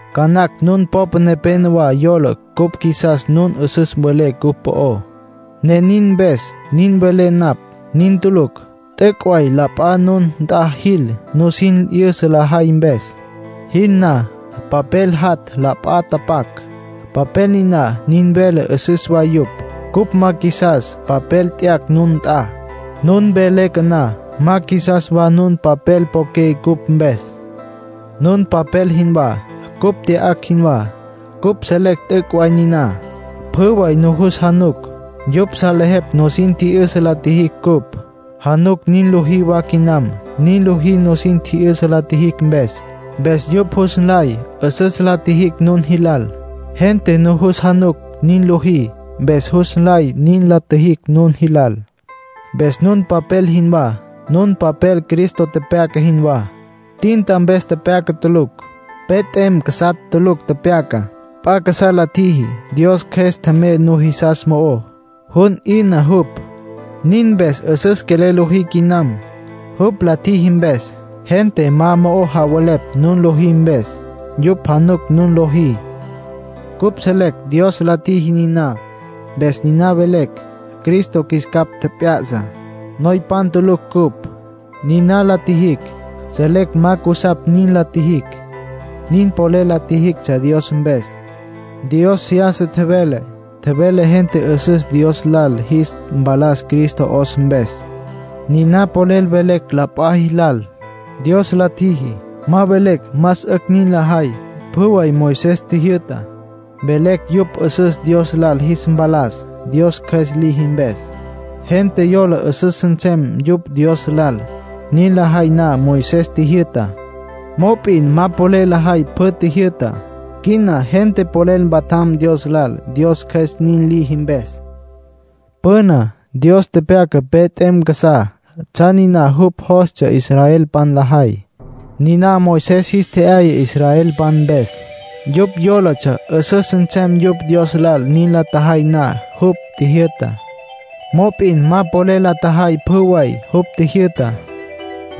Ca nacj nun popa nepénowa yola cupj qjuisas nun 'üsüs welé cupj po'ó, ne nin mpes nin velé napj. Nin tulucj. T'üc' way la p'a nun nt'a jil nusin 'yüsa lajay mpes. Jil na papel jat' la p'a tapac. Papel niná nin vele 'üsüs way yupj. Cupj ma qjuisas papel t'yacj nun nt'a. Nun mpe leque na, ma qjuisas wa nun papel poqué cupj mpes. Nun papel jinwá, cupj t'yacj jinwá. Cupj selecj t'üc' way niná. Pjü way nujus januc. Yupj salejepj nusin tji'yüsa la tjijicj cupj. Januc nin lojí wa quinam, nin lojí nusin tji'yüsa la tjijicj mpes. Mpes yupj jus nlay 'üsüs la tjijicj nun jilal. Gente nujus januc nin lojí, mpes jus nlay nin la tjijicj nun jilal. Mpes nun papel jinwá, nun papel Cristo tepyaca jinwá. Tinta mpes tulucj tepyaca. Pe t'em casá tulucj tepyaca. P'a casá la tjiji. Dios Cjües tjemey nujisas mo'ó. Jun 'yüna jupj. Nin mpes 'üsüs quelel lojí quinam, jupj la tjiji mpes. Gente ma mo'o javelepj nun lojí mpes; yupj januc nun lojí. Cupj selecj Dios la tjiji niná, mpes niná velecj. Cristo qjuis capj tjep'ya'sa. Noypan tulucj cupj. Niná la tjijicj, selecj ma cusapj nin la tjijicj. Nin polel la tjijictsja Dios mpes. Dios seyasa tjevele. Tjevele gente 'üsüs Dios lal jis mpalas Cristo 'os mpes. Niná polel velecj la p'a jilal, Dios la tjiji. Ma velecj más 'ücj nin lajay pjü way Moisés tjijyü'tá. Velecj yupj 'üsüs Dios lal jis mpalas, Dios Cjües liji mpes. Gente yola 'üsüs nsem yupj Dios lal, nin lajay na Moisés tjijyü'tá. Mop'in ma polel lajay pjü tjijyü'tá. Quina gente polel mpatjam Dios lal, Dios Cjües nin liji mpes. Püna Dios tepyaca pe t'em casá tsjan niná jupj jostsja israelpan lajay. Niná Moisés jis tje'yaya israelpan mpes. Yupj yólatsja 'üsüs nsem yupj Dios lal nin la tjajay na jupj tjijyü'tá. Mop'in ma polel la tjajay pjü way jupj tjijyü'tá.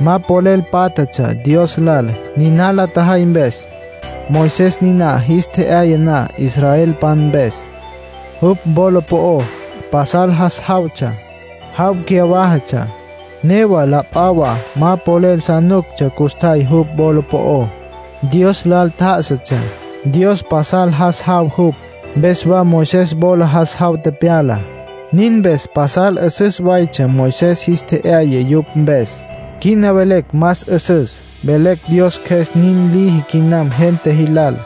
Ma polel pátjatsja Dios lal, niná la tjajay mpes. Moisés niná jis tje'yaya na israelpan mpes, jupj wola po'ó pasal jas jawtsja. Jaw cyawájatsja, newa la p'a wa ma polel sa nuctsja custjay jupj wola po'ó. Dios lal tjá'asatsja, Dios pasal jas jaw jupj, mpes wa Moisés wola jas jaw tepyala. Nin mpes pasal 'üsüs waytsja Moisés tje'yayá yupj mpes. Quina velecj más 'üsüs; velecj Dios Cjües nin liji quinam gente jilal.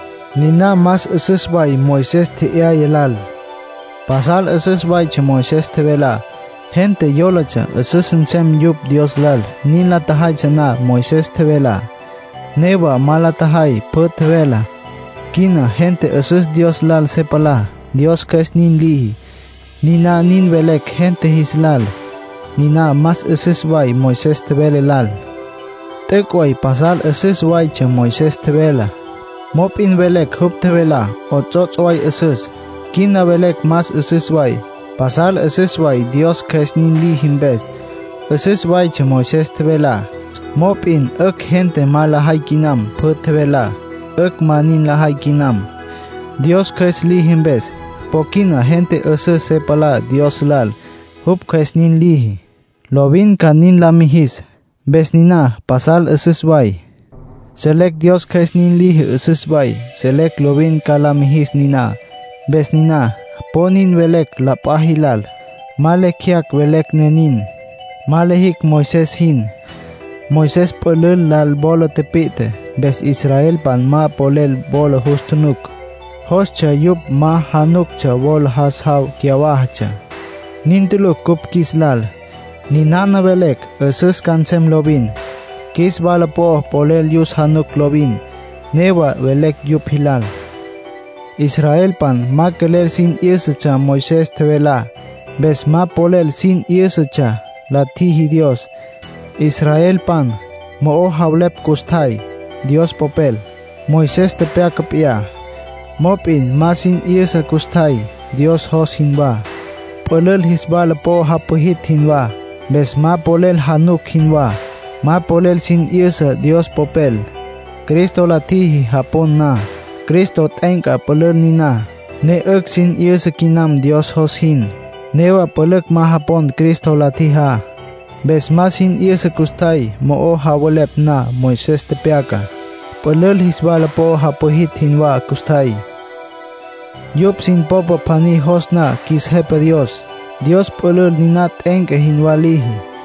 Niná más 'üsüs way Moisés tje'yaya lal. Pasal 'üsüs waytsja Moisés tjevelá. Gente yólatsja 'üsüs nsem yupj Dios lal nin la tjajaytsja na Moisés tjevelá. Newa ma polel la tjajay pjü tjevelá. Quina gente 'üsüs Dios lal se palá, Dios Cjües nin liji. Niná nin velecj gente jis lal, niná más 'üsüs way Moisés tjevele lal. T'üc' way pasal 'üsüs waytsja Moisés tjevelá. Pero velecj jupj tjevelá 'ots'ots' way 'üsüs; quina velecj más 'üsüs way. Pasal 'üsüs way Dios Cjües nin liji mpes. 'Üsüs waytsja Moisés tjevelá, mop'in 'ücj gente ma lajay quinam pjü tjevelá. 'Ücj ma nin lajay quinam, Dios Cjües liji mpes. Po quina gente 'üsüs se palá Dios lal, jupj Cjües nin liji. Lovin ca nin la mijis. Mpes niná pasal 'üsüs way. Selecj Dios Cjües nin liji 'üsüs way, selecj lovin ca la mijis niná. Mpes niná po nin velecj la p'a jilal. Ma lecj jeyacj velecj ne nin. Ma lijicj Moisés jin. Moisés pülül lal wola tipi'tje, mpes israelpan ma polel wola jus tjunuc. Jostsja yupj ma januctsja wola jas jaw cyawájatsja. Nin tulucj cupj qjuis lal. Ninana velecj, 'üsüs ca nsem lovin. Qjuis wala po'o polel yus januc lovin; newa velecj yupj jilal. Israelpan ma quelel sin 'yǘsatsja Moisés tjevelá. Mpes ma polel sin 'yǘsatsja, la tjiji Dios. Israelpan mo'o javelepj custjay Dios Popel, Moisés tepyaca p'iyá, mop'in ma sin 'yüsa custjay Dios jos jinwá. Pülül jis wala po'o japwijitj jinwá. Mpes ma polel januc jinwá, ma polel sin 'yüsa Dios Popel. Cristo la tjiji japon na, Cristo t'e'enca pülül niná, ne 'ücj sin 'yüsa quinam Dios jos jin. Newa pülücj ma japon Cristo la tjijá. Mpes ma sin 'yüsa custjay mo'o javelepj na Moisés tepyacá. Pülül jis wala po'o japwijitj jinwá custjay. Yupj sin popa pjaní jos na qjuis Jepa Dios, Dios pülül niná t'e'enca jinwá liji.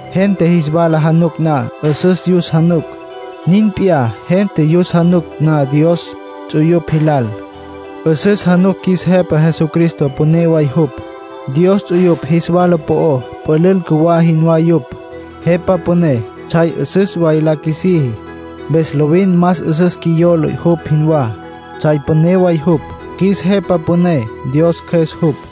Gente espejo januc na, 'üsüs yus januc. Nin p'iyá, gente yus januc na Dios ts'uyupj jilal, 'üsüs januc qjuis Jepa Jesucristo püné way jupj. Dios ts'uyupj jis wala po'ó pülül cjuwá jinwá yupj. Jepa Püné tsjay 'üsüs way la qjuisiji, mpes lovin más 'üsüs qjuiyola jupj jinwá, tsjay püné way jupj. Qjuis Jepa Püné Dios Cjües jupj.